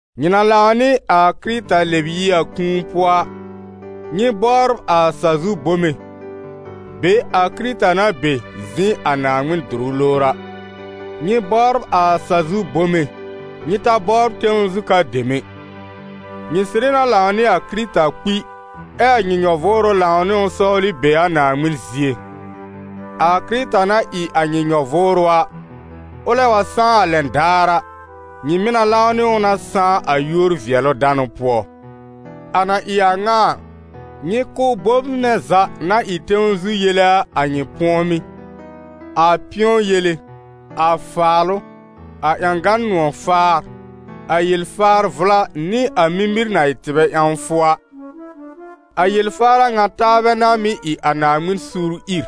Nyɩ na lãw nɩ a Kɩrɩta lɛb yi a kũu pʋɔ a, nyɩ bɔbr a sa-zu bome, be a Kɩrɩta na be zɩ̃ a Naaŋmɩn dʋrʋ lowr a. Nyɩ bɔbr a sa-zu bome, nyɩ ta bɔbr tẽw zu ka dem ɛ. Nyɩ sɩrɩ na lãw nɩ a Kɩrɩta kpi, ɛ a nyɩ nyɔ-vʋʋrʋ lãw nɩ ʋ sɔwlɩ be a Naaŋmɩn zie. A Kɩrɩta na ɩ a nyɩ nyɔ-vʋʋrʋ a, ʋlɛ wa sãá a lɛn daar a, nyɩ mɩ̀ na lãw nɩ ʋ na sãá a yúor-vɩɛlʋ-danʋ pʋɔ. A na ɩ a ŋa a, nyɩ kʋ́ bom nɛ za na ɩ tẽw zu yele a, a nyɩ pʋɔmɩ́: a pɩ̃ɔ yele, a faalʋ, a ƴãgan nʋ̃ɔ̀-faar, a yel-faar vʋla, nɩ a mimir na ɩ tɩbɛ ƴãwfʋ a. A yel-faar a ŋa taabɛ n'a mɩ́ ɩ a Naaŋmɩn suur ìr.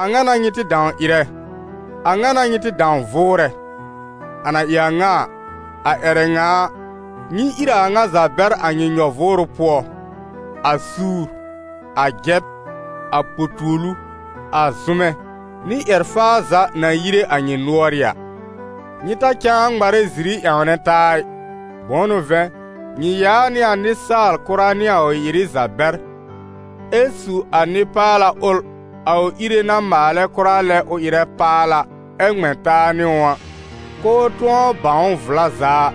A ŋa n'a nyɩ tɩ dãw ɩrɛ, a ŋa n'a nyɩ tɩ dãw vʋʋrɛ. A na ɩ a ŋa a, a ƴɛrɛ ŋa a, nyɩ ír a a ŋa za bɛr a nyɩ nyɔ-vʋʋrʋ pʋɔ: a suur, a jɛb, a po-tuolu, a zʋmɛ, nɩ ƴɛr-faa za na yire a nyɩ nʋ̀ɔrɩ́ a. Nyɩ ta cãa ŋmarɛ ziri ƴãwnɛ taa ɩ, bʋ̃ʋ n'ʋ vɛ̃, nyɩ yaa nɩ a nɩsaal-kʋra nɩ a ʋ ɩ-ɩrɩ za bɛr, ɛ su a nɩ-paala ʋl a ʋ Íre na maalɛ kʋra lɛ ʋ ɩrɛ paala, ɛ ŋmɛ̃ taa nɩ ʋ a, k'ʋʋ tʋ̃ɔ bãw ʋ vla za a.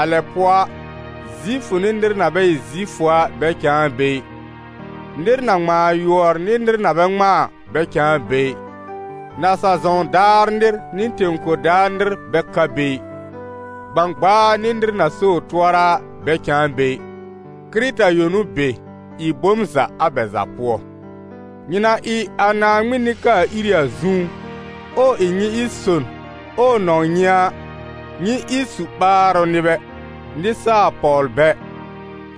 A lɛ pʋɔ a, Zifʋ nɩ nɩr na bɛ ɩ Zifʋ a bɛ cãa be ɩ, nɩr na ŋmãa yʋɔr nɩ nɩr na bɛ ŋmãa a, bɛ cãa be ɩ, nasa-zɔ̃w daar nɩr nɩ tẽ-kor daar nɩr bɛ ka be ɩ, gbãgbaa nɩ nɩr na so ʋ tʋɔra a, bɛ cãa be ɩ; Kɩrɩta yõ n'ʋ be, ɩ bom za a bɛ za pʋɔ. Nyɩ na ɩ a Naaŋmɩn nɩ-kaa-iri a zũú, ɛ ʋ ɩ nyɩ ɩ son, ɛ ʋ nɔ̃w nyɩ a, nyɩ ɩ su-ɓaarʋ nɩbɛ, nɩsaal-pɔwlbɛ,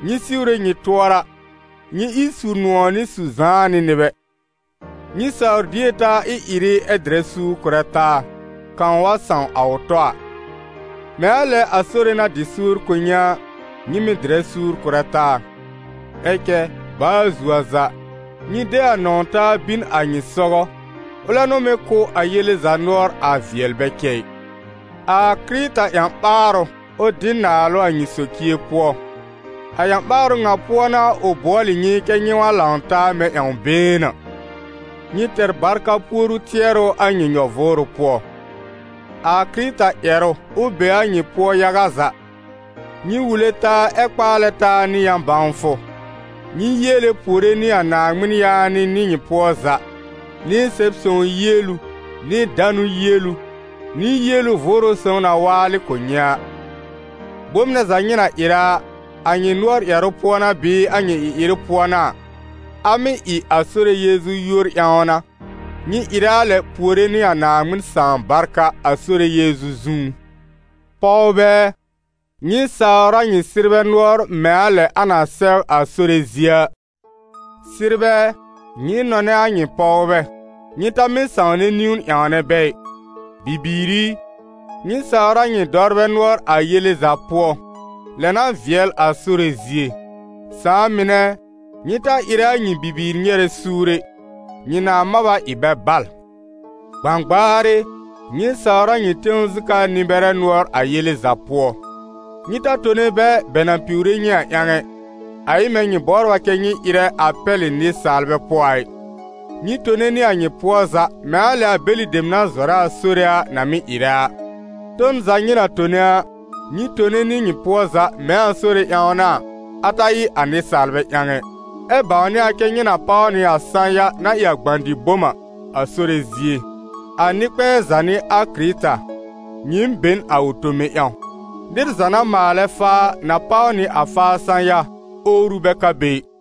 nyɩ siwre nyɩ tʋɔra, nyɩ ɩ su-nʋ̃ɔ̀ nɩ su-zãanɩ nɩbɛ. Nyɩ saw dier taa ɩ-ɩrɩ ɛ dɩrɛ suur kʋrɛ taa, kãw wa sãw a ʋ tɔ a: mɛ̃ a lɛ a Sore na dɩ suur kʋ̀ nyɩ a, nyɩ mɩ̀ dɩrɛ suur kʋrɛ taa. Ɛ cɛ baa zuo a za, nyɩ de a nɔ̃w-taa bin a nyɩ sɔgɔ, ʋlɛ n'ʋ mɩ́ kʋ́ a yele za nʋɔr a vɩɛl bɛ cɛ ɩ. A Kɩrɩta ƴã-ɓaarʋ, ʋ dɩ naalʋ a nyɩ socie pʋɔ, a ƴã-ɓaarʋ ŋa pʋɔ n'a ʋ bʋɔlɩ nyɩ kɛ́ nyɩ wa lãw taa mɛ̃ ƴãw-been a. Nyɩ tɛr barka puoru tɩɛrʋ a nyɩ nyɔ-vʋʋrʋ pʋɔ. A Kɩrɩta ƴɛrʋ, ʋ be a nyɩ pʋɔ yaga za. Nyɩ wule taa ɛ kpaalɛ taa nɩ yã-bãwfʋ. Nyɩ yiele puore nɩ a Naaŋmɩn yaanɩ nɩ nyɩ pʋɔ za, nɩ Sɛb-sõw yielu, nɩ danʋ yielu, nɩ yielu Vʋʋrʋ Sõw na waalɩ kʋ̀ nyɩ a. Bom nɛ za nyɩ na ɩrɛ a, a nyɩ nʋɔr ƴɛrʋ pʋɔ n'a bɩɩ a nyɩ ɩ-ɩrɩ pʋɔ n'a a, a mɩ́ ɩ a Sore Yeezu yúor ƴãw n'a, nyɩ ɩrɛ a lɛ puore nɩ a Naaŋmɩn Sãà barka a Sore Yeezu zũú. Pɔwbɛ ɛ, nyɩ sawr a nyɩ sɩrbɛ nʋɔr mɛ̃ a lɛ a na sɛw a Sore zie a. Sɩrbɛ ɛ, nyɩ nɔnɛ a nyɩ pɔwbɛ, nyɩ ta mɩ́ sãwnɛ niwn ƴãwnɛ bɛ ɩ. Bibiir i, nyɩ sawr a nyɩ dɔwrbɛ nʋɔr a yele za pʋɔ, lɛ n'a vɩɛl a Sore zie. Sãà mɩnɛ ɛ, nyɩ ta ɩrɛ a nyɩ bibiir nyɛrɛ suur ɛ, nyɩ nãa mab a ɩ bɛ bal. Gbãgbaar ɩ, nyɩ sawr a nyɩ tẽw zu ka nɩ-bɛrɛ nʋɔr a yele za pʋɔ. Nyɩ ta tone bɛ, bɛ na piwre nyɩ a ƴãw ɛ, a ɩ mɛ̃ nyɩ bɔbr a kɛ nyɩ ɩrɛ a pɛlɩ nɩsaalbɛ pʋɔ a ɩ; nyɩ tone nɩ a nyɩ pʋɔ za, mɛ̃ a lɛ a bɛlɩ dem na zɔrɛ a Sore a na mɩ́ ɩrɛ a. Ton za nyɩ na tone a, nyɩ tone nɩ nyɩ pʋɔ za mɛ̃ a Sore ƴãw n'a a, a ta ɩ a nɩsaalbɛ ƴãw ɛ, ɛ bãwnɩ a kɛ nyɩ na páw nɩ a sã-ya na ɩ a gbã-dɩ-bom a, a Sore zie. A Nɩ-kpɛ̃ɛ za n'ɩ a Kɩrɩta, nyɩɩm be n a ʋ tome ƴãw. Nɩr za na maalɛ faa a, na páw nɩ a faa sã-ya, owru bɛ ka be ɩ.